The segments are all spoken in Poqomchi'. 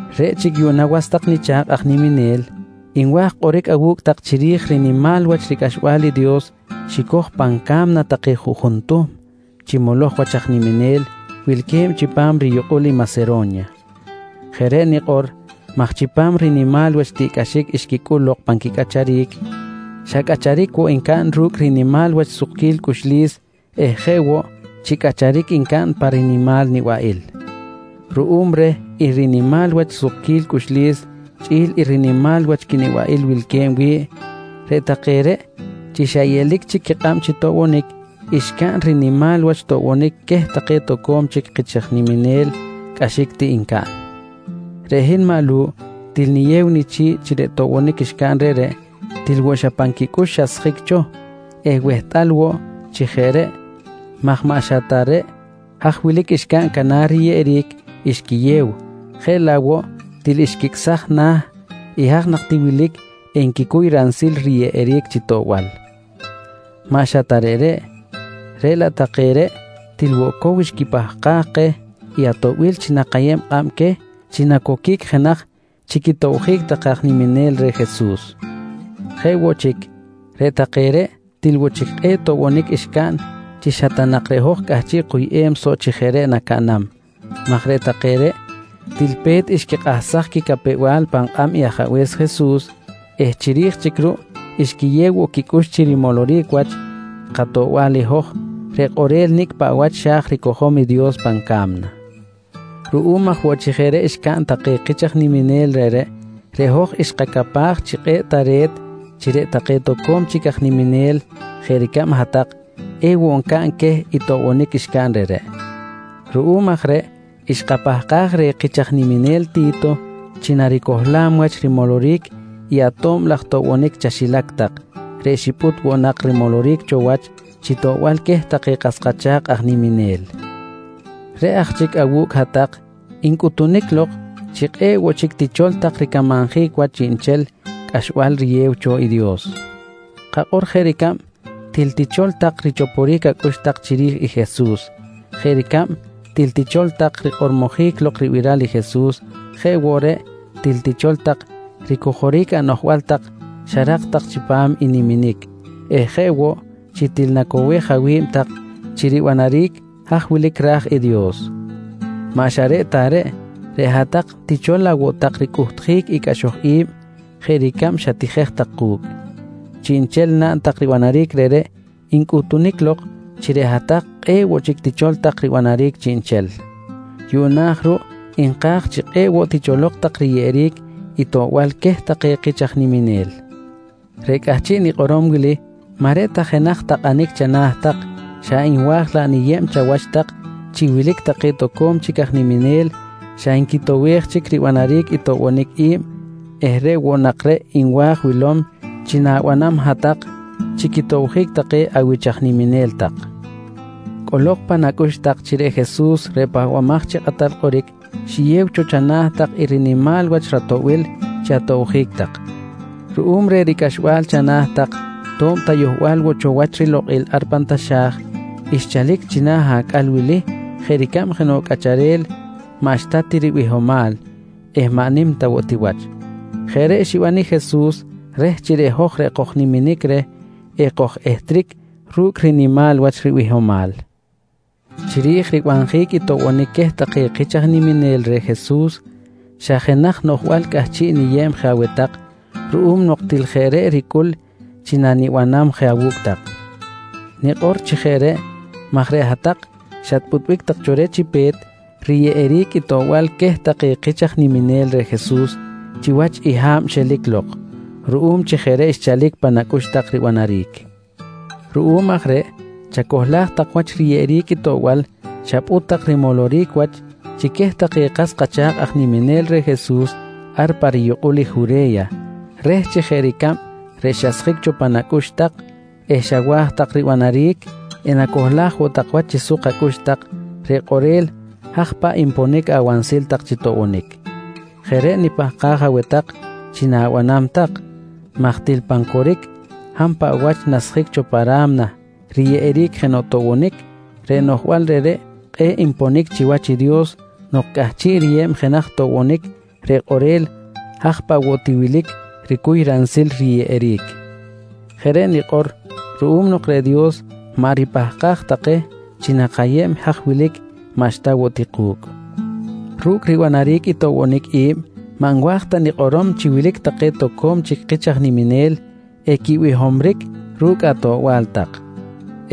Reꞌ chic yuꞌna was tak nicha̱kꞌ aj niminel, nwa̱j kꞌoric awu̱cꞌ tak chiri̱j rinimal wach ricꞌaxbal i Dios xicoj pan ca̱mna take juꞌjun tuhm chi moloj wach aj niminel wilque̱b chipam riyukꞌul i Masero̱nya. Jeꞌ reꞌ nikꞌor maj chipam i rinimal wach tiꞌcꞌaxic xquicꞌul lok pan quicꞌacharic, xa cꞌacharic woꞌ ncaꞌn ru̱cꞌ rinimal wach sukquil cꞌuxlis eh jeꞌ woꞌ chi cꞌacharic ncaꞌn pa rinimal nibaꞌil. Ruꞌum reh i rinimal wach sukquil cꞌuxlis chꞌi̱l i rinimal wach quinibaꞌil wilque̱b wi̱ꞌ, reꞌ take reꞌ chi xa yeꞌlic chic quikꞌab chi toꞌbonic, xcaꞌn rinimal wach toꞌbonic queh take toco̱m chic kich aj niminel cꞌaxic ti ncaꞌn. Reꞌ hin maꞌ Lu̱ꞌ til niyew nichi̱ꞌ chi reꞌ toꞌbonic xcaꞌn reꞌreꞌ til woꞌ xa pan quicꞌux xasjic cho eh wehtꞌal woꞌ chi jeꞌ reꞌ maj maꞌ xa ta reꞌ haj wilic xcaꞌn canar riyeꞌeric xquiyew jeꞌ laꞌ woꞌ til xquicꞌsaj na̱ i haj nak ti wilic enquicuy ransil riyeꞌeric chi toꞌbal. Maꞌ xa ta reꞌreꞌ, reꞌ laꞌ take reꞌ til woꞌ cow xquipahkaj keh i atoꞌbil chi nakayeb kꞌab queh chi nacoquic jenaj chi quitobjic take aj niminel reh Jesus. Jeꞌ woꞌ chic, reꞌ take reꞌ til woꞌ chic kꞌe̱ꞌ toꞌbonic xcaꞌn chi xa ta nak reꞌ hoj cꞌahchiꞌ kuyꞌem soꞌ chi jeꞌ reꞌ nacaꞌnam maj reꞌ take reꞌ til pe̱t xquikꞌahsaj quicapew-bal pan kꞌab i Ajabe̱s Jesus eh chiri̱j chic ruꞌ xquiyew woꞌ quicꞌux chi rimoloric wach katoꞌbal i hoj reꞌ kꞌorel nicꞌ paꞌ wach xa̱j ricojom i Dios pan ca̱mna. Ruꞌum aj woꞌ chi jeꞌ reꞌ xcaꞌn take kich aj niminel reꞌreꞌ, reꞌ hoj xkacapaj chi kꞌe̱ꞌ tare̱t chi reꞌ take toco̱m chic aj niminel jeꞌ ricab hat-tak, ewoꞌ ncaꞌn queh i toꞌbonic xcaꞌn reꞌreꞌ. Ruꞌum aj reꞌ xkapahkaj reh i kich aj niminel Ti̱to chi naricohlam wach rimoloric i ato̱b laj toꞌbonic chaxilac tak reꞌ xipꞌut woꞌ nak rimoloric cho wach chi toꞌbal queh take kas kacha̱kꞌ aj niminel. Reꞌ aj chic awu̱cꞌ hat-tak ncꞌutunic lok chi kꞌe̱ꞌ woꞌ chic tichol tak ricamanjic wach chiꞌnchel cꞌaxbal riyew cho i Dios. Kakꞌor jeꞌ ricab til tichol tak richoporic acꞌux tak chiri̱j i Jesus, jeꞌ ricab til tichol tak rikꞌormojic lok ribiral i Jesus jeꞌ woꞌ reꞌ til tichol tak ricojoric anoꞌjbal tak xarak tak chipam i niminic eh jeꞌ woꞌ chi til nacowej awi̱b tak chi ribanaric haj wilic ra̱j i Dios. Maꞌ xa reꞌ ta reꞌ, reꞌ hat-tak tichol laꞌ woꞌ tak ricꞌuhtjic i cꞌaxoj i̱b jeꞌ ricab xatijej tak ku̱cꞌ. Chiꞌnchel naꞌn tak ribanaric reꞌreꞌ ncꞌutunic lok chi reꞌ hat-tak kꞌe̱ꞌ woꞌ chic tichol tak ribanaric chiꞌnchel. Yuꞌna aj ruꞌ nka̱j chi kꞌe̱ꞌ woꞌ ticholok tak riyeꞌeric i toꞌbal queh take kich aj niminel. Reꞌ cꞌahchiꞌ nikꞌorom wili maꞌ reꞌ ta jenaj takꞌanic chana̱ tak xa nwa̱j laꞌ niyeb chawach tak chi wilic take toco̱m chic aj niminel xa nquitowej chic ribanaric i toꞌbonic i̱b eh reꞌ woꞌ nak reꞌ nwa̱j wilom chi na̱banam hat-tak chi quitobjic take awich aj niminel tak. Cꞌolok pan acꞌux tak chi reꞌ Jesus reꞌ Pahbamaj chi Kꞌatal Kꞌoric xiyew cho chana̱ tak i rinimal wach ratoꞌbil chi atobjic tak. Ruꞌum reh ricꞌaxbal chana̱ tak to̱b ta yohbal woꞌ cho wach rilokꞌil ar pan taxa̱j, xchalic china̱ acꞌal wili jeꞌ ricab jenoꞌ cꞌacharel maꞌxta ti ribihomal eh maꞌ nim ta woꞌ ti wach. Jeꞌ reꞌ xiban i Jesus reh chi reꞌ hoj reꞌ kojniminic reh, ekoj-ehtric ru̱cꞌ rinimal wach ribihomal. Chiri̱j ribanjic i toꞌbonic queh take kich aj niminel reh Jesus xa jenaj noꞌjbal cꞌahchiꞌ niyeb je aweh tak ruꞌum nok til jeꞌ reꞌ ricꞌul chi nanibanam je awu̱cꞌ tak. Nikꞌor chi jeꞌ reꞌ maj reꞌ hat-tak xatpꞌutbic tak cho reh chi pe̱t riyeꞌeric i toꞌbal queh take kich aj niminel reh Jesus chiwach i ha̱b xelic lok, ruꞌum chi jeꞌ reꞌ xchalic pan acꞌux tak ribanaric. Ruꞌum aj reꞌ chacohlaj tak wach riyeꞌeric i toꞌbal xapꞌut tak rimoloric wach chi queh take kas kacha̱kꞌ aj niminel reh Jesus ar pa riyukꞌul i Jure̱ya reh chi jeꞌ ricab reꞌ xasjic cho pan acꞌux tak eh xawa̱j tak ribanaric enacohlaj woꞌ tak wach chi suk acꞌux tak, reꞌ kꞌorel haj paꞌ nponic awansil tak chi toꞌbonic. Jeꞌ reꞌ nipahkaj aweh tak chi na̱banam tak maj til pan coric hab paꞌ wach nasjic cho pa ra̱mna riyeꞌeric jenoꞌ toꞌbonic, reꞌ noꞌjbal reꞌreꞌ kꞌe̱ꞌ nponic chiwach i Dios nok cꞌahchiꞌ riyew jenaj toꞌbonic reꞌ kꞌorel haj paꞌ woꞌ ti wilic ricuy ransil riyeꞌeric. Jeꞌ reꞌ nikꞌor ruꞌum nok reꞌ Dios maꞌ ripahkaj ta keh chi nakayeb i haj wilic maꞌxta woꞌ ti ku̱cꞌ. Ru̱cꞌ ribanjic i toꞌbonic i̱b maꞌ nwa̱j ta nikꞌorom chi wilic take toco̱m chic kich aj niminel equibihomric ru̱cꞌ atoꞌbal tak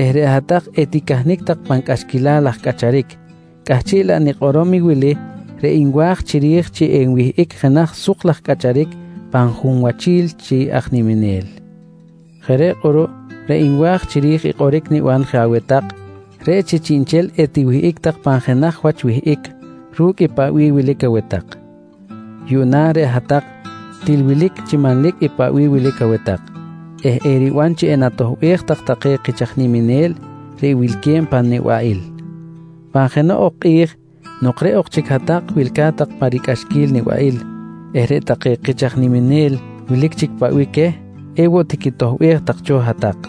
eh reꞌ hat-tak eticahnic tak pan cꞌaxquilal laj cꞌacharic, cꞌahchiꞌ laꞌ nikꞌorom i wili reꞌ nwa̱j chiri̱j chi enwihꞌic jenaj suk laj cꞌacharic pan junwachil chi aj niminel. Jeꞌ reꞌ kꞌuruꞌ reꞌ nwa̱j chiri̱j i kꞌoric niban je aweh tak reꞌ chi chiꞌnchel etiwihꞌic tak pan jenaj wach wihꞌic ru̱cꞌ paꞌ bih wilic aweh tak. Yuꞌna reꞌ hat-tak til wilic chi manlic i paꞌ bih aweh tak eh eriban chi enatoꞌbej tak take kich aj niminel reꞌ wilque̱b pan nibaꞌil. Pan jenoꞌ ok kꞌi̱j nok reꞌ ok chic hat-tak wilca̱t tak pan ricꞌaxquil nibaꞌil eh reꞌ take kich aj niminel wilic chic paꞌ bih queh, ewoꞌ tiquitoꞌbej tak cho hat-tak.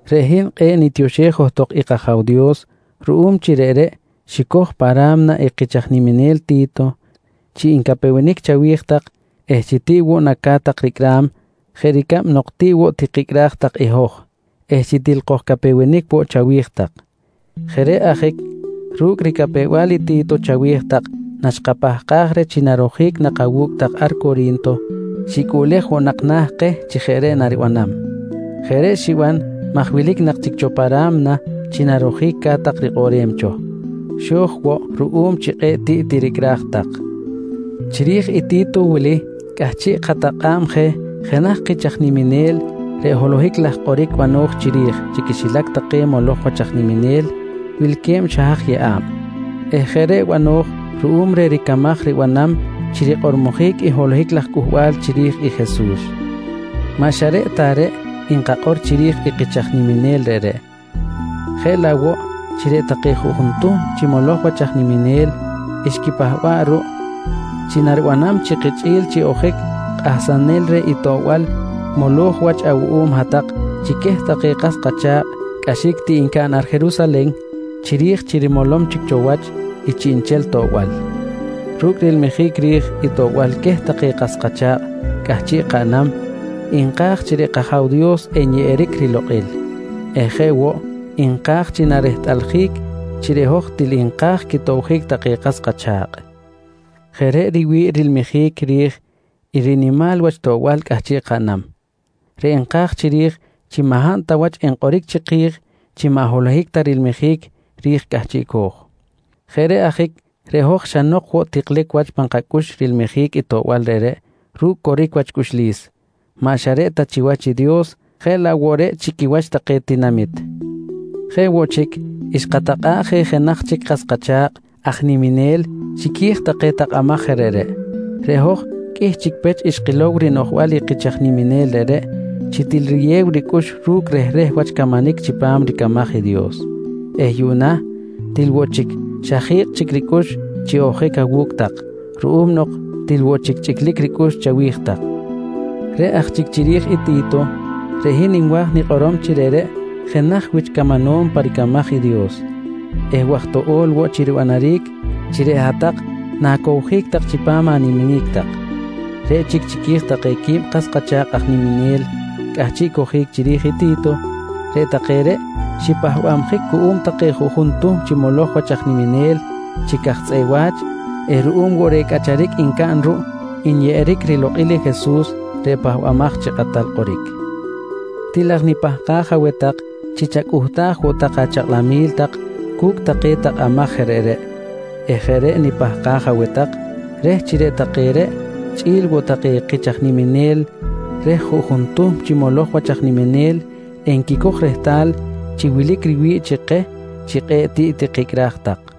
Reꞌ hin kꞌe̱ꞌ nitioxej johtok i kAja̱w Dios ruꞌum chi reꞌreꞌ xicoj pa ra̱mna i kich aj niminel Ti̱to chi ncapewenic chawi̱j tak eh chi tiꞌ woꞌ naca̱t tak ricꞌram jeꞌ ricab nok tiꞌ woꞌ tikicꞌraj tak i hoj eh chi til kojcapewenic woꞌ chawi̱j tak. Jeꞌ reꞌ ajic ru̱cꞌ i ricapew-bal i Ti̱to chawi̱j tak naxkapahkaj reh chi narojic nak awu̱cꞌ tak ar Cori̱nto, xicꞌuꞌlej woꞌ na̱ keh chi jeꞌ reꞌ naribanam. Jeꞌ reꞌ xiban maj wilic nak chic cho pa ra̱mna chi narojic ca̱t tak rikꞌoꞌrem cho, xo̱j woꞌ ruꞌum chi kꞌe̱ꞌ tiꞌ tiricꞌraj tak. Chiri̱j i Ti̱to wili cꞌahchiꞌ katakꞌa̱b je jenaj kich aj niminel reꞌ holohic laj kꞌoric bano̱j chiri̱j chi quixilac take moloj wach aj niminel wilque̱b xa haj yeꞌa̱b eh jeꞌ reꞌ bano̱j ruꞌum reh ricamaj ribanam chi rikꞌormojic i holohic laj cꞌuhbal chiri̱j i Jesus. Maꞌ xa reꞌ ta reꞌ nkakꞌor chiri̱j i kich aj niminel reꞌreꞌ jeꞌ laꞌ woꞌ chi reꞌ take juꞌjun tuhm chi moloj wach aj niminel xquipahba̱ꞌ ruꞌ chi naribanam chi kichꞌi̱l chi ojic kꞌahsanel reh i toꞌbal moloj wach awuꞌum hat-tak chi queh take kas kacha̱kꞌ cꞌaxic ti ncaꞌn ar Jerusalen, chiri̱j chi rimolom chic cho wach i chiꞌnchel toꞌbal. Ru̱cꞌ rilmijic ri̱j i toꞌbal queh take kas kacha̱kꞌ cꞌahchiꞌ kaꞌnam, nka̱j chi reꞌ kAja̱w Dios enyeꞌeric rilokꞌil eh jeꞌ woꞌ nka̱j chi narehtꞌaljic chi reꞌ hoj til nka̱j quitobjic take kas kacha̱kꞌ. Jeꞌ reꞌ riwi̱ꞌ rilmijic ri̱j i rinimal wach toꞌbal cꞌahchiꞌ kaꞌnam, reꞌ nka̱j chiri̱j chi maꞌ hab ta wach enkꞌoric chiki̱j chi maꞌ holohic ta rilmijic ri̱j cꞌahchiꞌco̱j. Jeꞌ reꞌ ajic reꞌ hoj xa nok woꞌ cho tiklic wach pan kacꞌux rilmijic i toꞌbal reꞌreꞌ ru̱cꞌ coric wach cꞌuxlis, maꞌ xa reꞌ ta chiwach i Dios jeꞌ laꞌ woꞌ reꞌ chi quiwach take tinamit. Jeꞌ woꞌ chic xkatakꞌa̱ꞌ je jenaj chic kas kacha̱kꞌ aj niminel chiqui̱j take takꞌamaj je reꞌreꞌ. Reꞌ hoj qꞌuih chic pech xkilow rinoꞌjbal i kich aj niminel reꞌreꞌ chi til riyew ricꞌux ru̱cꞌ rehreh wach camanic chipam ricamaj i Dios eh yuꞌna til woꞌ chic xa ji̱kꞌ chic ricꞌux chi ojic awu̱cꞌ tak ruꞌum nok til woꞌ chic chꞌiclic ricꞌux chawi̱j tak. Reꞌ aj chic chiri̱j i Ti̱to, reꞌ hin nwa̱j nikꞌorom chi reꞌreꞌ jenaj wich camanom pa ricamaj i Dios eh waj toꞌo̱l woꞌ chi ribanaric chi reꞌ hat-tak na̱cowjic tak chipam animinic tak. Reꞌ chic chiqui̱j take quib kas kacha̱kꞌ aj niminel cꞌahchiꞌ cojic chiri̱j i Ti̱to, reꞌ take reꞌ xipahbabjic cuꞌum take juꞌjun tuhm chi moloj wach aj niminel chi caj tzꞌeꞌ wa̱ch eh ruꞌum woꞌ reh cꞌacharic ncaꞌn ruꞌ nyeꞌeric rilokꞌil Jesus reꞌ Pahbamaj chi Kꞌatal Kꞌoric. Til aj nipahkaj aweh tak chi chacꞌuhtaj woꞌ tak achakꞌlamil tak cu̱cꞌ take takꞌamaj je reꞌreꞌ eh jeꞌ reꞌ nipahkaj aweh tak reh chi reꞌ take reꞌ chꞌi̱l woꞌ take kich aj niminel reh juꞌjun tuhm chi moloj wach aj niminel enquicoj rehtal chi wilic riwi̱ꞌ chi keh chi kꞌe̱ꞌ tiꞌ tikicꞌraj tak.